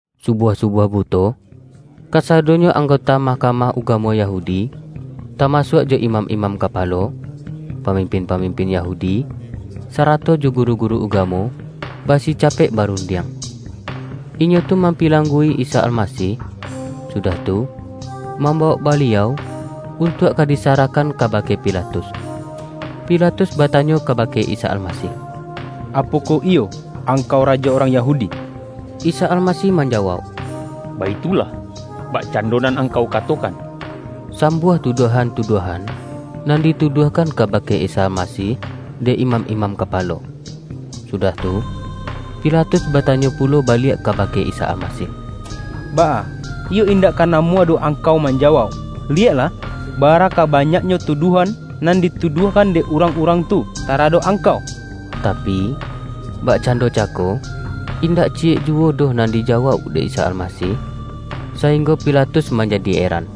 Subuah-subuah buto, kasado-nyo anggota Mahkamah Uga-mo Yahudi, tamasuak jo imam-imam kapalo, pamimpin-pamimpin Yahudi, sarato jo guru-guru ugamo, basica-pek barundiang. Inyo tu mampilang-gu-i Isa Almasih, sudah tu, mambawok Baliau, untuak ka disarahkan kabake Pilatus. Pilatus batanyo kabake Isa Almasih,”Apokoh iyo Angkau Rajo urang Yahudi?” Isa Almasih manjawauk,”Baitulah, bakcando nan angkau katokan.” Sambuah tuduahan-tuduahan, nan dituduahkan kabake Isa Almasih, dek imam-imam kapalo. Sudah tu, Pila-tus batanyo pulo baliak kabake Isa Almasih,”Baa, iyo indak ka namuah doh Angkau manjawauk? Liyeklah, bara ka banyaknyo tuduahan, nan di-tuduahkan dek urang-urang tu tara-dok Angkau!” Tapi, bakcando cako, indak ciyek ju-wo doh nan dijawauk dek Isa Almasih, sainggo Pilatus manjadi eran.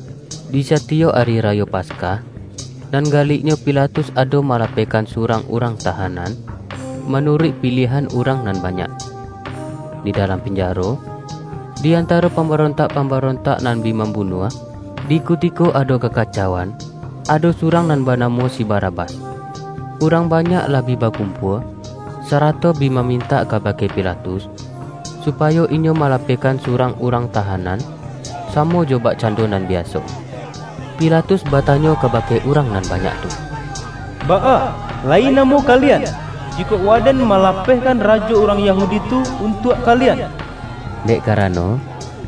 Di satiyok Ari Rayo Paskah, nan galiknyo Pilatus ado malapehkan su-rang urang tahanan, manuruik piliahan urang nan banyak. Di dalam pinjaro, di antaro pambarontak-pambarontak nan bi mambunuah, di kutiko ado ka-kacauan, ado surang nan banamo si Ba-rabas. Urang banyak lah bi bakumpua, sarato bi mamintak kabake Pilatus, su-payo inyo malapehkan surang urang tahanan, samo jo bakcando nan biaso. Pilatus batanyo kabake urang nan ba-nyak tu,”Baa, layi namuah kalian, jikok waden malapehkan Rajo urang Yahudi tu, untuak kalian?” Dek karano,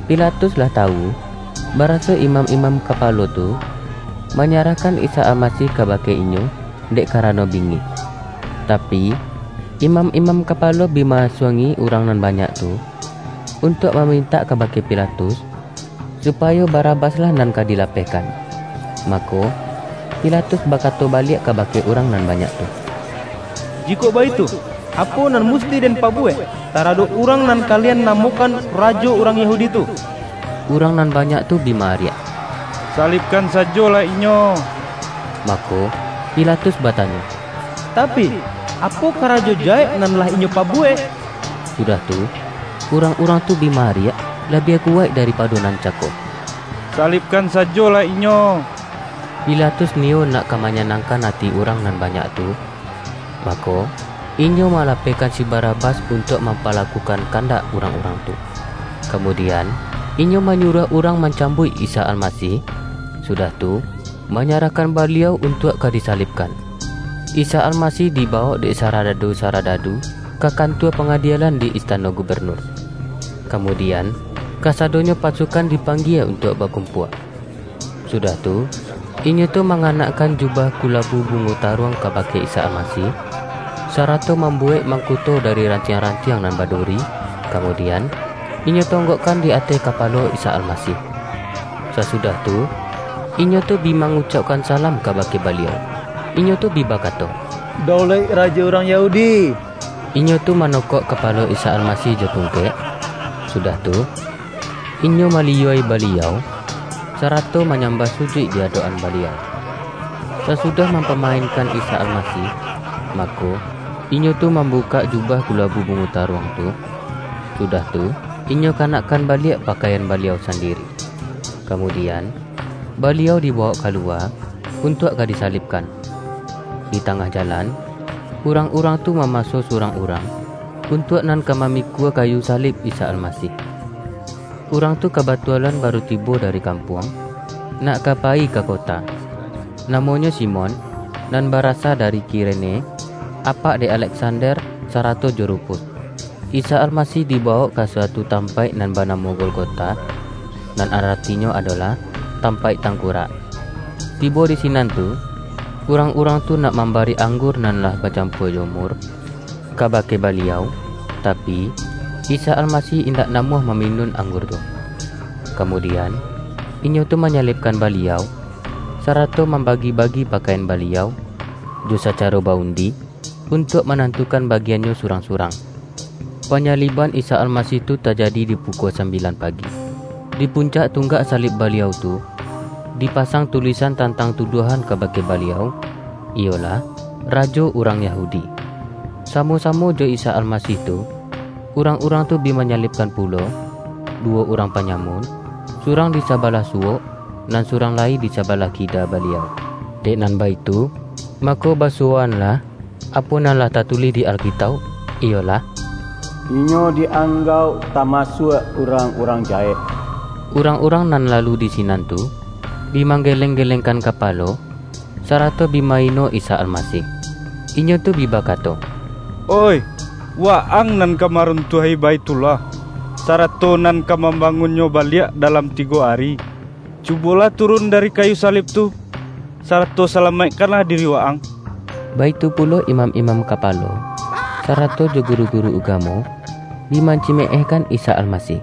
Pi-latus lah tawu, baraso imam-imam ka-palo tu, manyarahkan Isa Almasih ka-bake inyo, dek karano bingik. Tapi, imam-imam kapalo bi ma-asuang-i urang nan banyak tu, un-tuak mamintak kabake Pilatus, supa-yo Barabas-lah nan ka dilapehkan. Mako, Pilatus bakato baliak kaba-ke urang nan banyak tu,”Jikok baitu, apo nan musti den pabuwek, taradok Urang nan kalian namokan Rajo urang Yahudi tu?” Urang nan banyak tu bi ma-ariak,”Salibkan sajolah Inyo!” Mako, Pilatus batanyo,”Tapi, apo karajo jahek nan lah Inyo pabu-wek?” Sudah tu, urang-urang tu bi ma-ariak, labiah kuwaik daripado nan cako,”Salibkan sajolah Inyo!” Pilatus niyo nak ka manyanang-kan ati urang nan banyak tu, mako, inyo malapehkan si Barabas untuak mampalakukan kandak urang-urang tu. Kamudian, inyo manyuruah urang mancambuik Isa Almasih, sudah tu, manyarahkan Baliau untuak ka di-salibkan. Isa Almasih dibawok dek sarada-du-saradadu ka kantua pangadielan di istano gubenur. Kamudian, kasadonyo pasukan dipanggie untuak bakumpua. Sudah tu, inyo tu manganakkan ju-bah kulabu bungo taruang kabake Isa Almasih, sarato mambuwek mangkuto dari rantiang-rantiang nan baduri, ka-mudian, inyo tonggokkan di ateh ka-palo Isa Almasih. Sasudah tu, inyo tu bi mangucaukkan salam kabake Baliau. Inyo tu bi bakato,”Daulaik Ra-jo urang Yahudi!” Inyo tu manokok kapalo Isa Almasih jo tungkek, sudah tu, inyo maliyua-i Baliau, sarato ma-nyambah sujuik di adok-an Baliau. Sasudah mampamainkan Isa Alma-sih, mako, inyo tu mambukak jubah kulabu bungo taruang tu, sudah tu, inyo kanakkan baliak pakaian Baliau sandiri. Kamudian, Baliau dibawok ka-luwa, untuak ka disalibkan. Di tangah jalan, urang-urang tu ma-maso surang urang, untuak nan ka ma-mikua kayu salib Isa Almasih. Urang tu kabatualan baru tibo dari kampuang, nak ka payi ka kota. (Namonyo Simon, — nan barasa dari Kirene, apak dek Aleksander, sarato jo Rufus.) Isa Almasih dibawok ka suatu tampaik nan banamo Golgota, nan aratinyo adolah”Tampaik Tangkurak”. Tibo di sinan tu, urang-urang tu nak mambari ang-gur nan lah bacampua jo mur, kabake Baliau, tapi, Isa Almasih indak namuah maminun anggur tu. Kamudian, inyo tu manyalibkan Baliau, sarato mam-bagi-bagi pakaian Baliau, jo sacaro ba-undi untuak manantukan bagian-nyo surang-surang. Panyaliban Isa Almasih tu tajadi di pukua sambilan pagi. Di puncak tunggak salib Baliau tu, dipasang tulisan tantang tuduahan kabake Baliau, iyolah:”Rajo Urang Ya-hudi”. Samo-samo jo Isa Almasih tu, urang-urang tu bi manyalibkan pulo, duwo urang panyamun, surang di sa-balah suwok, nan surang lai di saba-lah kida Baliau. [ Dek nan baitu, ma-ko basuwoanlah, apo nan lah tatulih di Alkitauk; iyolah:”Inyo di-anggauk tamasuak urang-urang jahek.”] Urang-urang nan lalu di sinan tu, bi manggeleng-gelengkan kapalo, sa-rato bi ma-ino Isa Almasih. Inyo tu bi bakato,”Oih, Wa-ang nan ka marun-tuahi Baithullah, sarato nan ka mam-bangunnyo baliak dalam tigo ari. Cu-bolah turun dari kayu salib tu, sarato salamaikkanlah diri Wa-ang!” Baitu pulo imam-imam kapalo, sa-rato jo guru-guru ugamo, bi mancime-ehkan Isa Almasih.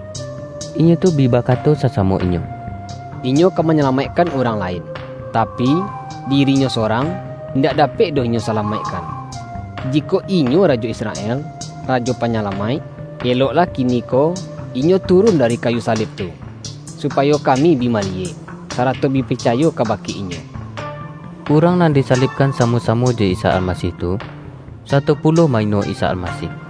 Inyo tu bi bakato sasamo inyo,”Inyo ka manyalamaik-kan urang lain, tapi, diri-Nyo sorang, indak dapek doh Inyo salamaikkan! Jikok Inyo rajo Israel, Rajo Panya-lamaik, eloklah kiniko Inyo turun dari kayu salib tu, supayo kami bi maliyek, sarato bi picayo kabake Inyo!” Urang nan disalibkan samo-samo jo Isa Almasih tu, sato pulo ma-ino Isa Almasih.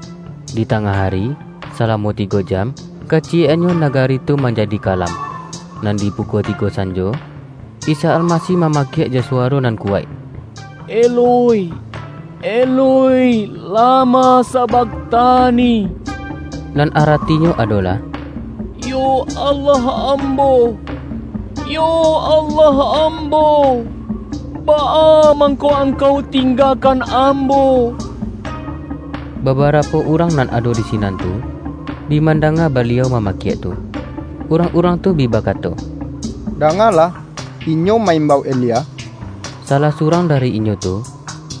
Di tangah ari, salamo tigo jam, kaciyek-annyo nagari tu manjadi ka-lam. Nan di pukua tigo sanjo, Isa Almasih mamakiak jo suwaro nan ku-waik,”Eloi, Eloi, lama sabakhtani?” nan aratinyo adolah,”Yo Allah Ambo, yo Allah Ambo, baa mangko Angkau tinggakan Ambo?” Babarapo urang nan ado di sinan tu, bi mandanga Baliau mamakiak tu, urang-urang tu bi bakato,”Dangalah, Inyo ma-imbau Elia!” Salah surang dari inyo tu,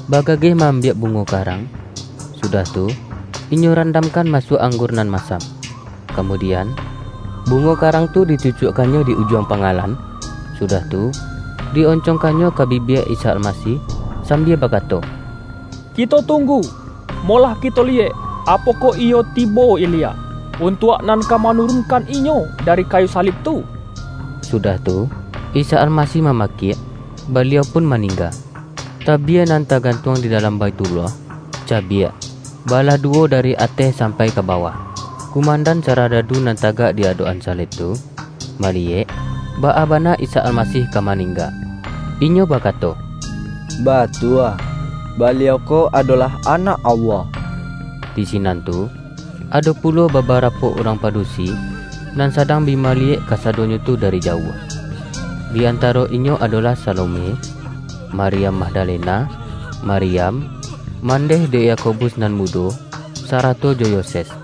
bagageh ma-ambiak bu-ngo karang, sudah tu, inyo randamkan masuak anggur nan masam. Kamu-dian, bungo karang tu dicucuakkan-nyo di ujuang pangalan, sudah tu, di oncongkannyo ka bibia Isa Almasih, sambia bakato,”Kito tunggu, molah kito liyek, apokoh iyo tibo Elia, un-tuak nan ka manurunkan Inyo dari kayu salib tu.” Sudah tu, Isa Almasih mamakiak, Baliau pun maningga. Tabie nan tagantuang di dalam Baithullah, cabiak, balah duwo dari ateh sampai ka bawah. Kumandan saradadu nan tagak di adok-an salib tu, maliyek, baa bana Isa Almasih ka maningga. Inyo bakato,”Batua, Baliau ko adolah Anak Allah!” Di sinan tu, ado pulo babarapo urang padusi, nan sadang bi maliyek kasadonyo tu dari jauah. Di antaro inyo adolah Salome, Maryam Magdalena, Maryam, mandeh dek Yakobus nan mudo sarato jo Yoses.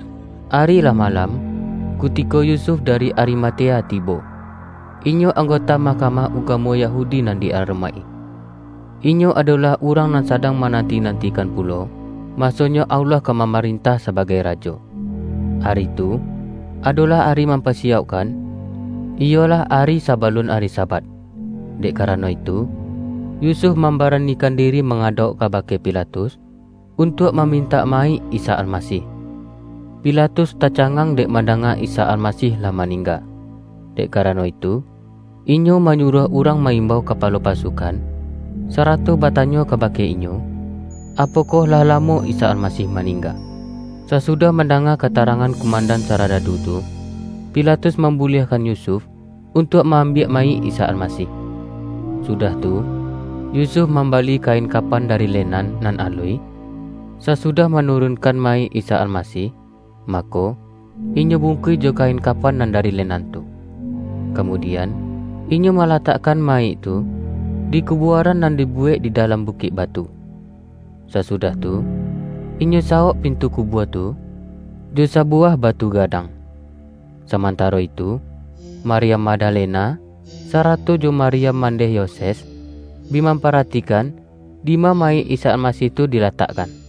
Ari lah malam, kutiko Yusuf da-ri Arimatea tibo. Inyo anggota Mahka-mah Ugamo Yahudi nan di aromaik-i. Inyo adolah urang nan sadang ma-nanti-nantikan pulo, masonyo Allah ka mamarentah sabagai Rajo. Ari tu, adolah ari Mampasiyaukkan, (iyolah ari sabalun ari Sabat). Dek karano itu, Yusuf mambaranikan diri mangadauk kabake Pilatus, untuak mamintak ma-yik Isa Almasih. Pilatus tacangang dek mandanga Isa Almasih lah maning-ga. Dek karano itu, inyo manyuruah urang ma-imbau kapalo pasukan, sara-to batanyo kabake inyo, apokoh lah la-mo Isa Almasih maningga. Sasudah mandanga katarangan kumandan sara-dadu tu, Pilatus mambuliahkan Yusuf, untuak ma-ambiak mayik Isa Alma-sih. Sudah tu, Yusuf mambali kain kapan dari lenan nan aluih, sasudah manurunkan mayik Isa Almasih, ma-ko, inyo bungkuih jo kain kapan nan dari lenan tu. Kamudian, inyo ma-latakkan mayik tu, di kubuaran nan dibuwek di dalam bukik batu. Sasu-dah tu, inyo sawok pintu kubua tu, jo sabuwah batu gadang. Saman-taro itu, Maryam Magdalena, sarato jo Maryam mandeh Yoses, bi mam-paratikan, dima mayik Isa Almasih tu dilatakkan.